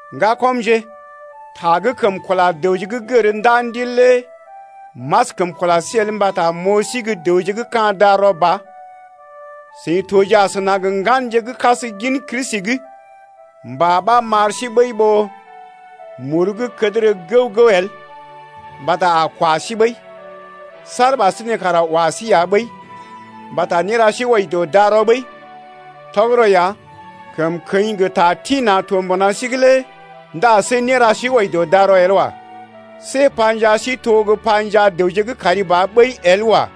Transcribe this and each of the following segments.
Ŋgakɔmje, ta gə́ kəm kula dəwje gə́ gər ndaa Ndil lé m’askəm kula sí el mbata m’oo sí gə́ dəwje gə́ ka̰ darɔ ba, seḭ toje asəna gə ŋganje gə́ kas gin Kristi’g. Mbà ɓa m’ar sí ɓəi ɓó muru gə́ kədərə gəw-gəw el mbata a kwa sí ɓəi. Saar ɓasinè kara wa sí ya ɓəi mbata néra sí wɔji dɔ darɔ ɓəi. Tɔgərɔ ya, kəmkəḭ gə ta tḭ-na̰ to mbuna sí’g lé ndá see néra sí wɔji dɔ darɔ el wa. See panjaa sí to gə́ panjaa dəwje gə́ kari ba ɓəi el wa.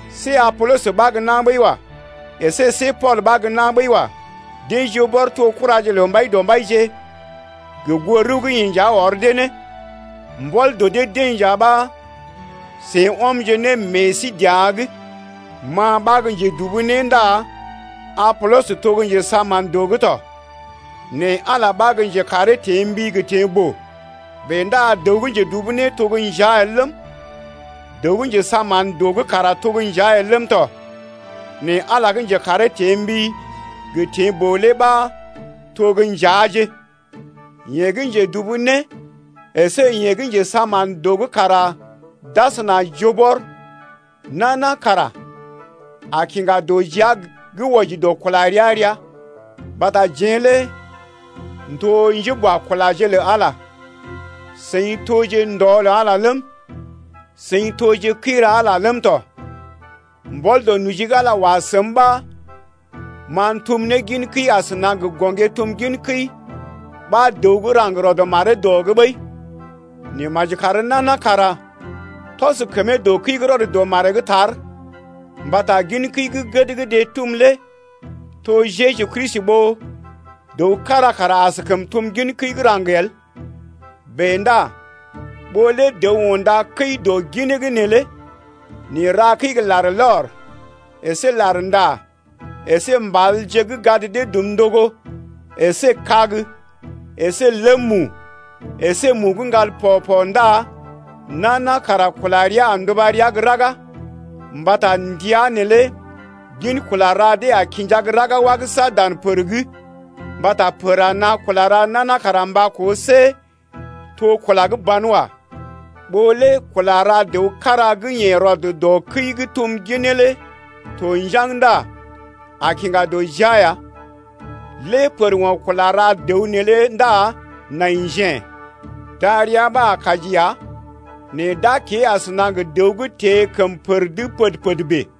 See Apolɔs ɓa gə́ na̰ ɓəi wa. Esé see Pool ɓa gə́ na̰ ɓəi wa. Deḛ joo bɔr to kuraje lə Mbaidɔmbaije gə goo rəw gə́ yeḛ nja ɔr dee ne. Mbɔl dɔ dee-deḛ nja ɓa seḭ ɔmje ne meḛ sí dəa’g. Ma ɓa gə́ njedubu né ndá Apolɔs to gə́ njesaa mán dɔ’g tɔ, né Ala ɓa gə́ njekaree teḛ mbi gə teḛ boo. Bèe ndá dəw gə́ njedubu né to gə́ njea el ləm, dəw gə́ njesaa mán dɔ’g kara to gə́ njea el ləm tɔ. Nɛ Ala gə́ njekaree teḛ mbi gə teḛ boo lé ɓa to gə́ njeaje. Yeḛ gə́ njedubu né əsé yeḛ gə́ njesaa mán dɔ’g kara d’asəna joo bɔr, nana kara a kiŋga dɔ jia gə́ wɔji dɔ kula rəa-rəa. Mbata jeḛ lé n’to njéboakulaje lə Ala lé. Seḭ toje ndɔ lə Ala ləm, seḭ toje kəi ra Ala ləm tɔ. Mbɔl dɔ noji gə́ Ala wa səm ɓa ma m’tum ne gin kəi asəna gə gɔŋgé-tum-gin-kəi ɓa dəw gə́ raŋg rɔd maree dɔ’g ɓəi. Nɛ maji kar nana kara tɔs kəmee dɔ kəi gə́ rɔd dɔ maree’g tar. Mbata gin kəi gə́ gəd gə́ deḛ tum lé to Jeju Kristi ɓó dəw kára kara askəm tum gin kəi gə́ raŋg el. Bèe ndá ɓó lé dəw unda kəi dɔ ginee’g neelé nɛ ra kəi gə larlɔr əsé larnda, əsé mbalje gə́ gad dee dum ndogo, əsé kag əsé ləm mu, əsé mu gə́ ŋgal pɔ-pɔ ndá nana kara kula rəa a nduba rəa gə́ raga. Mbata ndəa neelé gin kula ra dee a kinja gə́ raga wagəsa dan pər’g mbata pər a naa kula ra nana kara mba koo see to kula gə́ ban wa. Ɓó lé kula ra dəw kára gə́ yeḛ rɔd dɔ kəi gə́ tum ginee lé to njaŋg ndá a kiŋga dɔ jia ya. Lée pər o̰ kula ra dəw neelé ndá nai njḛ, darəa ɓa a kaji ya nɛ d’a kée asəna gə dəw gə́ teḛ kəm pər’g pəd-pəd bèe.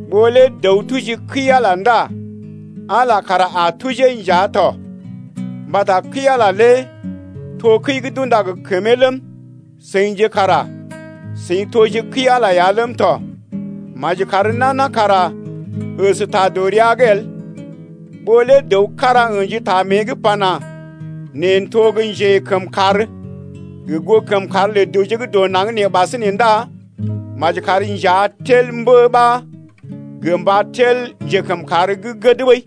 Ɓó lé dəw tuji kəi-Ala ndá Ala kara a tujee nja tɔ, mbata kəi-Ala lé to kəi gə́ d’unda gə kəmee ləm, seḭje kara seḭ toje kəi-Ala ya ləm tɔ. Maji kar nana kara əsta dɔ rəa’g el. Ɓó lé dəw kára ə̰ji ta mée’g pana: Neḛ n’to gə́ njekəmkàr gə goo kəmkàr lə dəwje gə́ dɔ naŋg nee ɓasinè ndá maji kar njea tel mbə ɓa gə mba tel njekəmkàr gə́ gəd ɓəi.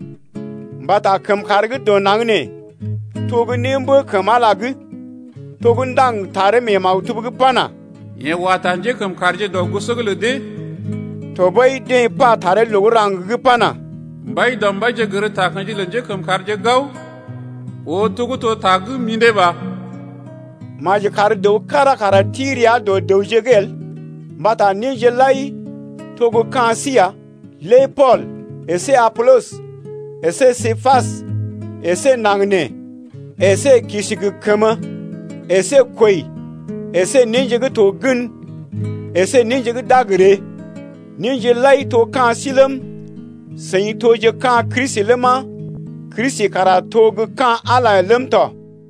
Mbata kəmkàr gə́ dɔ naŋg nee to gə́ némbə kəm Ala’g lé to gə́ ndaŋg taree mee maktub’g pana: Yeḛ wa ta njékəmkàrje dɔ goso’g lə dee. Tɔɓəi deḛ pa taree loo gə́ raŋg’g pana: Mbaidɔmbaije gər takə̰ji lə njékəmkàrje gao, Oo to gə́ to ta gə́ mḭdé ba. Maji kar dəw kára kara ti rəa dɔ dəwje’g el mbata néje lai to gə́ ka̰ sí ya: lé Pool əsé Apolɔs əsé Képas, əsé naŋg nee, əsé kisi gə kəmə, əsé kwəi əsé néje gə́ to gən, əsé néje gə́ d’a gə ree. Néje lai to gə́ ka̰ sí ləm, seḭ toje ka̰ Kristi ləma, Kristi kara to gə́ ka̰ Ala ləm tɔ.